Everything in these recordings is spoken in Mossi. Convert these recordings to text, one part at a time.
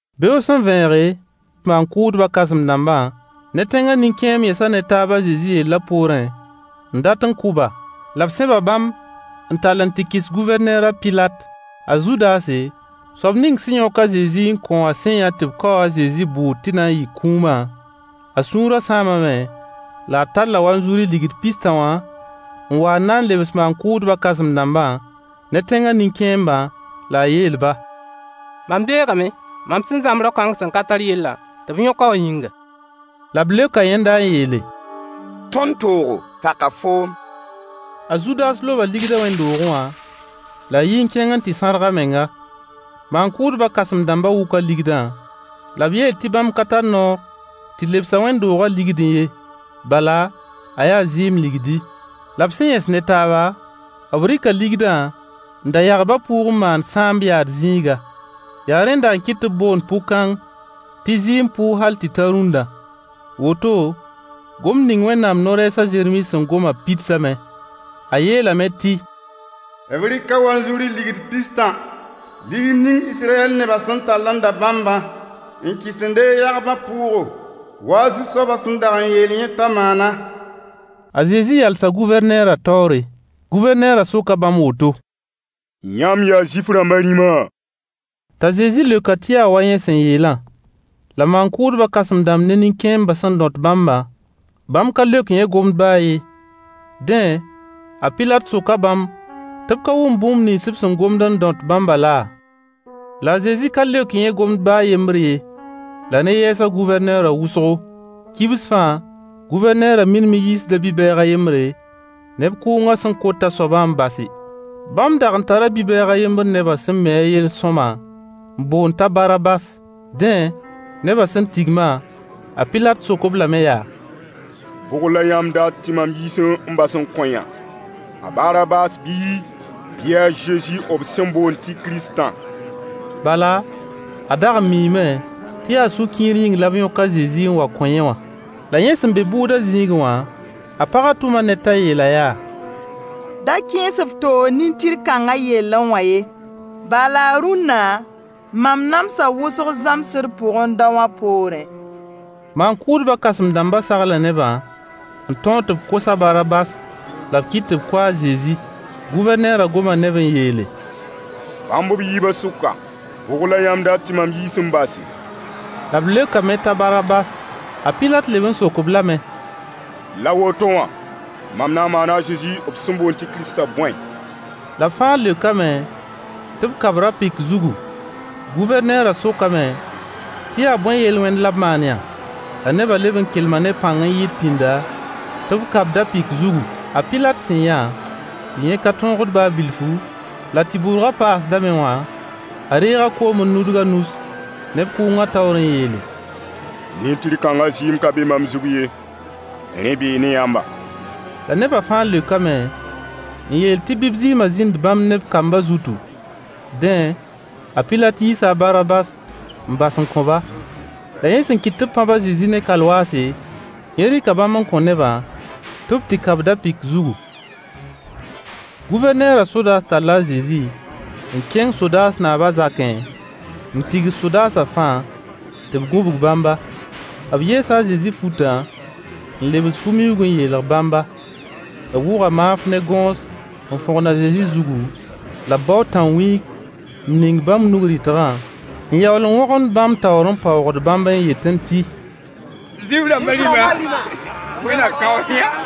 Beoog sẽn vẽege, maan-kʋʋdbã kãsem-dãmbã ne tẽngã nin-kẽemb yẽsa ne taab a Zezi yellã poorẽ n dat n kʋ-ba. La b sẽba bãmb n tall n tɩ kɩs Gʋvɛrneer a Pilat. A Zudase, soab ning sẽn yõk a Zezi n kõ wã sẽn yã tɩ b kaoo a Zezi bʋʋd tɩ na n yɩ kũumã, a sũurã sãamame, la a talla wanzuri ligd pis-tã wã n wa n na n lebs maan-kʋʋdbã kãsem-dãmbã ne tẽngã nin-kẽembã la a yeel-ba: Mam beegame, mam sẽn zãmb rao-kãng sẽn ka tar yellã tɩ b yõk-a wã yĩnga. La b leoka yẽnda n yeele: Tõnd toogo? Paka foom. A Zudas loba ligdã wẽnd-doogẽ wã la a yi n kẽng n tɩ sãrg a menga. Maan-kʋʋdbã kãsem-dãmbã wʋka ligdã, la b yeel tɩ bãmb ka tar noor tɩ lebs-a wẽnd-doogã ligdẽ ye, bala, a yaa zɩɩm ligdi. La b sẽn yẽs ne taaba, b rɩka ligdã n da yagbã pʋʋg n maan sãamb yaad zĩiga. Yaa rẽnda n kɩt tɩ b boond pʋ-kãng tɩ zɩɩm pʋʋg hal tɩ ta rũnna. Woto, gomd ning Wẽnnaam no-rɛɛs a Zeremi sẽn goma pidsame. A yeelame tɩ: B rɩka wanzuri ligd pis-tã, ligd ning Israyɛl nebã sẽn tall n da bãmbã, n kɩs n deeg yagbã pʋʋgo, wa Zu-soabã sẽn dag yeel yẽ t'a maanã. A Zezi yalsa Gʋvɛrneerã taoore. Gʋvɛrneerã soka bãmb woto: Yãmb yaa Zuif-rãmb rĩma? T'a Zezi leok-a tɩ yaa wa yẽ sẽn yeelã: La maan-kʋʋdbã kãsem-dãmb ne nin-kẽembã sẽn dõt bãmbã, bãmb ka leok yẽ gomd baa a yen. Dẽ, a Pilat soka bãmb tɩ b ka wʋmd bũmb nins fãa b sẽn gomd n rõt bãmbã laa? La a Zezi ka leok yẽ gomd baa a yembr ye, la rẽ yɛɛsa Gʋvɛrneerã wʋsgo. Kibs fãa, Gʋvɛrneerã minim n yiisda bi-bɛɛg a yembre, neb kʋʋngã sẽn kot a soabã n base. Bãmb dag n tara bi-bɛɛg a yembr nebã sẽn mi a yell sõama, n boond t'a Barabas. Dẽ, nebã sẽn tigmã, a Pilat sok-b lame yaa: Bʋg la yãmb dat tɩ mam yiis n bas n kõ-yã? A Barabas bii, bɩ a Zezi b sẽn boond tɩ Kiristã? Bala, a dag n miime tɩ yaa sũ-kiir yĩng la b yõk a Zezi n wa kõ yẽ wã. La yẽ sẽn be bʋʋda zĩigẽ wã, a pagã tʋma ned t'a yeel-a yaa: Da kẽes f toog nin-tɩr-kãngã yellẽ wã ye, Bala rũnna, mam namsa wʋsg zãmsd pʋgẽ daowã poorẽ. Maan-kʋʋdbã kãsem-dãmbã sagla nebã n tõog tɩ b kos a Barabas la b kɩt tɩ b kʋ a Zezi. Gʋvɛrneerã goma ne-b n yeele: Bãmb b yiibã sʋka, bʋg la yãmb dat tɩ mam yiis n base? La b leokame t'a Barabas. A Pilat leb n sok-b lame: La woto wã, mam na n maana a Zezi b sẽn boond tɩ Kiristã bõe? La b fãa leokame tɩ b ka-b ra-pɩk zugu. Gʋvɛrneerã sokame tɩ yaa bõe yel-wẽnd la b maan-yã? La nebã leb n kelma ne pãng n yɩɩd pĩnda, tɩ b ka-b da-pɩk zugu. A Pilat sẽn yã tɩ yẽ ka tõogd baa bilfu, la tɩ bʋrgã paasdame wã, a reega koom n nudg a nus neb kʋʋngã taoor n yeele: Nin-tɩr-kãngã zɩɩm ka be mam zug ye. Rẽ bee ne yãmba. La nebã fãa leokame n yeel tɩ bɩ b zɩɩmã zĩnd bãmb ne b kambã zutu. Dẽ, a Pilat yiisa a Barabas n bas n kõ-ba. La yẽ sẽn kɩt tɩ b pãb a Zezi ne kalwaase, yẽ rɩka bãmb n kõ nebã tɩ b tɩ ka-b da-pɩk zugu. Gʋvɛrneerã sodaas talla a Zezi n kẽng sodaas naabã zakẽ, n tigs sodaasã fãa tɩ b gũbg bãmba. B yeesa a Zezi futã, n lebs fu-miuug n yeelg bãmba. B wʋga maanf ne gõos n fõgen a Zezi zugu, la b bao tã-wĩig n ning b nug-rɩtgã, n yaool n wõgemd bãmb taoor n paoogd bãmb n yetẽ tɩ: Zuif-rãmbã rĩma, Wẽnd na kaoos-yã!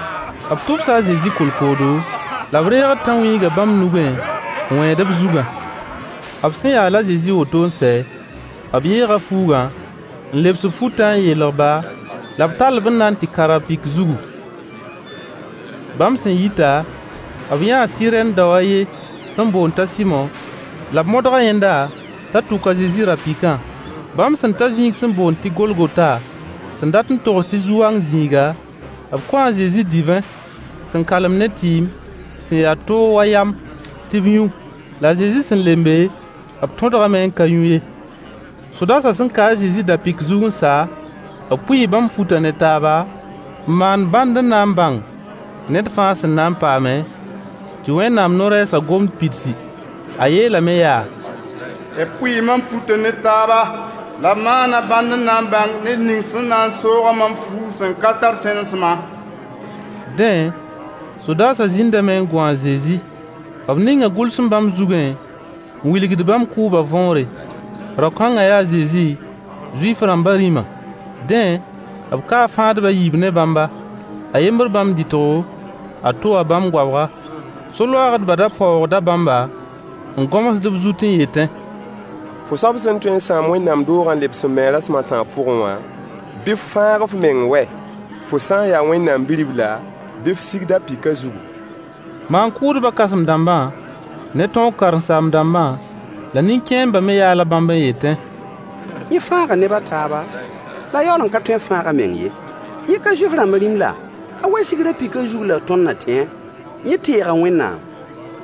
B tʋbsa a Zezi kolkoodo, la b reegd tã-wĩigã bãmb nugẽ n wẽed b zugã. B sẽn yaal a Zezi woto n sɛ, b yeega fuugã n lebs b futã n yeelg-ba, la b tall-b n na n tɩ ka ra-pɩk zugu. Bãmb sẽn yita, b yãa Sɩrɛn dao a yen sẽn boond t'a Sɩmo, la b modga yẽnda t'a tʋk a Zezi ra-pɩkã. Bãmb sẽn ta zĩig sẽn boond tɩ Golgota, sẽn dat n togs tɩ zu-wang zĩiga, b kõo a Zezi divẽ sẽn kalem ne tɩɩm sẽn ya toog wa yam tɩ b yũ. La a Zezi sẽn lembe, b tõdgame n ka yũ ye. Sodaasã sẽn ka a Zezi da-pɩk zug n sa, b pʋɩɩ bãmb futã ne taaba, n maan bãnd n na n bãng ned fãa sẽn na n paame, [tɩ Wẽnnaam no-rɛɛsã gomd pidsi. A yeelame yaa: B pʋɩɩ mam futã ne taaba, la b maana bãnd n na n bãng ned ning sẽn na n soog-a mam fuug sẽn ka tar sẽnesmã.] Dẽ, sodaasã zĩndame n gũ a Zezi. B ninga gʋlsem bãmb zugẽ n wilgd bãmb kʋʋbã võore: Rao-kãngã yaa a Zezi, Zuif-rãmbã rĩma. Dẽ, b kaa fãadb a yiib ne bãmba: a yembr bãmb dɩtgo, a to wã bãmb goabga. So-loaagdbã da paoogda bãmba, n gõmsd b zut n yetẽ: Fo soab sẽn tõe n sãam wẽnd-doogã n lebs-a n me rasem a tãab pʋgẽ wã, bɩ f fãag f meng wɛ! Fo sã n yaa Wẽnnaam Bi-ribla, bɩ f sig da-pɩkã zugu. Maan-kʋʋdbã kãsem-dãmbã ne tõog karen-saam-dãmbã, la nin-kẽembã me yaala bãmb n yetẽ: Yẽ fãaga neb a taaba, la a yaool n ka tõe n fãag a meng ye. Yẽ ka Zuif-rãmb rĩm la! A wa sig ra-pɩkã zug la tõnd na tẽ-a. Yẽ teega Wẽnnaam: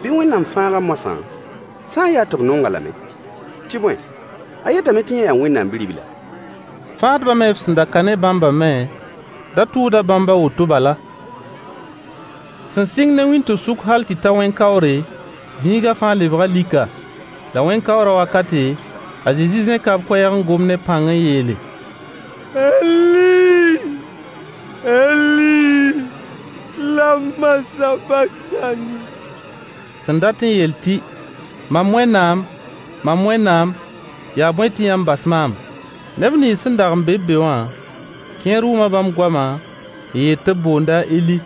bɩ Wẽnnaam fãag-a moasã, sã n yaa tɩ b nong-a lame. Tɩ bõe, a yetame tɩ yẽ yaa Wẽnnaam Bi-ribla. Fãadbã me b sẽn ka ne bãmbã me da tʋʋda bãmb a woto bala. Sẽn sɩng ne wĩnto-sʋk hal tɩ ta wẽn-kaoore, zĩigã fãa lebga lika. La wẽn-kaoorã wakate, a Zezi zẽka b koɛɛg n gom ne pãng n yeele: Eli! Eli! Lama sabaktani? Sẽn dat n yeel tɩ: “Mam Wẽnnaam! Mam Wẽnnaam! Yaa bõe tɩ yãmb bas maam?” Neb nins sẽn dag n be-b be wã, kẽer wʋma bãmb goamã n yeel tɩ b boonda a Eli.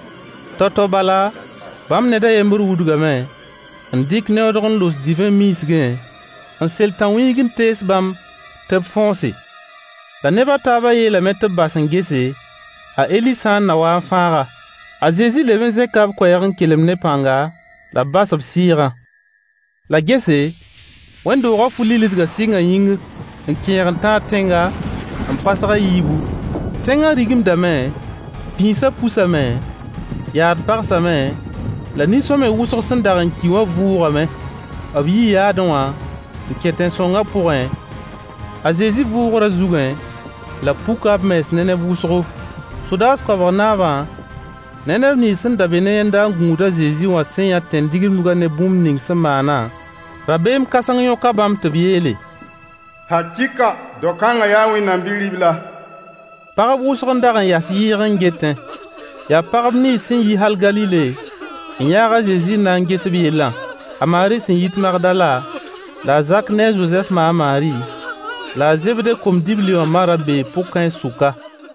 Tao-tao bala, bãmb ned a yembr wudgame n dɩk neoodg n los divẽ miisgẽ, n sel tãnwĩig n tees bãmb tɩ b fõose. La neb a taabã yeelame tɩ b bas n gese, a Eli sã n na wa n fãag-a. A Zezi leb n zẽka b koɛɛg n kelem ne pãnga, la b bas b sɩɩga. La gese, wẽnd-doogã fu-lillidgã sɩnga yĩngr n kẽeg n tãag tẽnga, n pasg a yiibu. Tẽngã rigimdame, pĩisã pusame, yaad pagsame, la nin-sõamy wʋsg sẽn dag n ki wã vʋʋgame. B yii yaadẽ wã n kẽ tẽn-sõngã pʋgẽ, a Zezi vʋʋgrã zugẽ, la b puka b mens ne neb wʋsgo. Sodaas koabg naabã ne neb nins sẽn dag be ne yẽnda n gũud a Zezi wã sẽn yã tẽn-digimdgã ne bũmb ning sẽn maanã, rabeem kãseng yõka bãmb tɩ b yeele: Hakɩɩka, dao-kãngã yaa Wẽnnaam Bi-ribla. Pagb wʋsg n dag n yas yɩɩg n getẽ. Yaa pagb nins sẽn yi hal Galile n yãag a Zezi n na n ges b yellã: A Maari sẽn yit Magdala, la a Zak ne a Zozɛf ma a Maari, la a Zebde kom-dibli wã ma ra bee pʋg-kãens sʋka.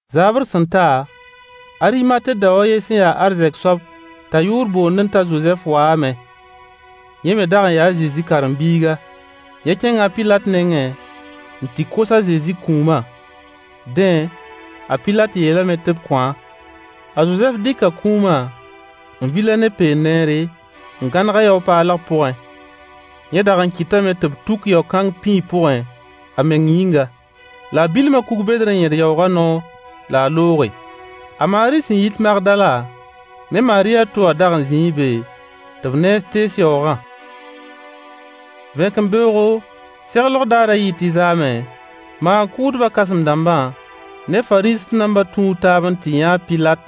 Zaabr sẽn ta, Arimate dao a yen sẽn ya arzɛk soab t'a yʋʋr boondẽ t'a Zozɛf waame. Yẽ me dag n yaa a Zezi karen-biiga. Yẽ kẽnga a Pilat nengẽ n tɩ kos a Zezi kũumã. Dẽ, a Pilat yeelame tɩ b kõ-a. A Zozɛf dɩka kũumã, n vil-a ne lẽ peend sẽn ya sõama, n gãneg-a yao-paalg pʋgẽ. Yẽ dag n kɩtame tɩ b tuk yao-kãng pĩig pʋgẽ a meng yĩnga. La a bilma kug-bedr n yẽd yaoogã noor la a looge. A Maari sẽn yit Magdala ne Maari a to wã dag n zĩi be tɩ b nens tees yaoogã. Vẽkembeoogo, seglg daarã yɩ tɩ zaamẽ, maan-kʋʋdbã kãsem-dãmbã ne Fariisẽ-dãmbã tũu taab n tɩ yã a Pilat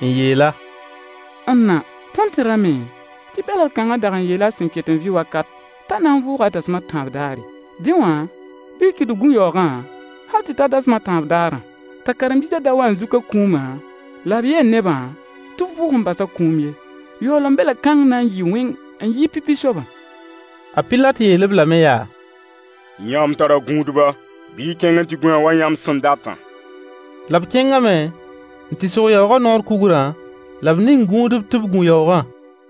n yeel-a: N na! Tõnd tẽrame tɩ bɛlgd-kãngã dag n yeela a sẽn ket n vɩ wakat t'a na n vʋʋga dasem a tãab daarã. Dẽ wã, bɩ y kɩt tɩ b gũ yaoogã hal tɩ ta dasem a tãab daarã, t'a karen-biisã da wa n zuk a kũumã la b yeel nebã tɩ b vʋʋg n basa kũum ye. Yaoolem belg-kãng na n yɩɩ wẽng n yɩɩg pipi soabã. A Pilat yeel-b lame yaa: Yãmb tara gũudba. Bɩ y kẽng n tɩ gũ-a wa yãmb sẽn datã. La b kẽngame n tɩ sog yaoogã noor kugrã, la b ning gũudb tɩ b gũ yaoogã.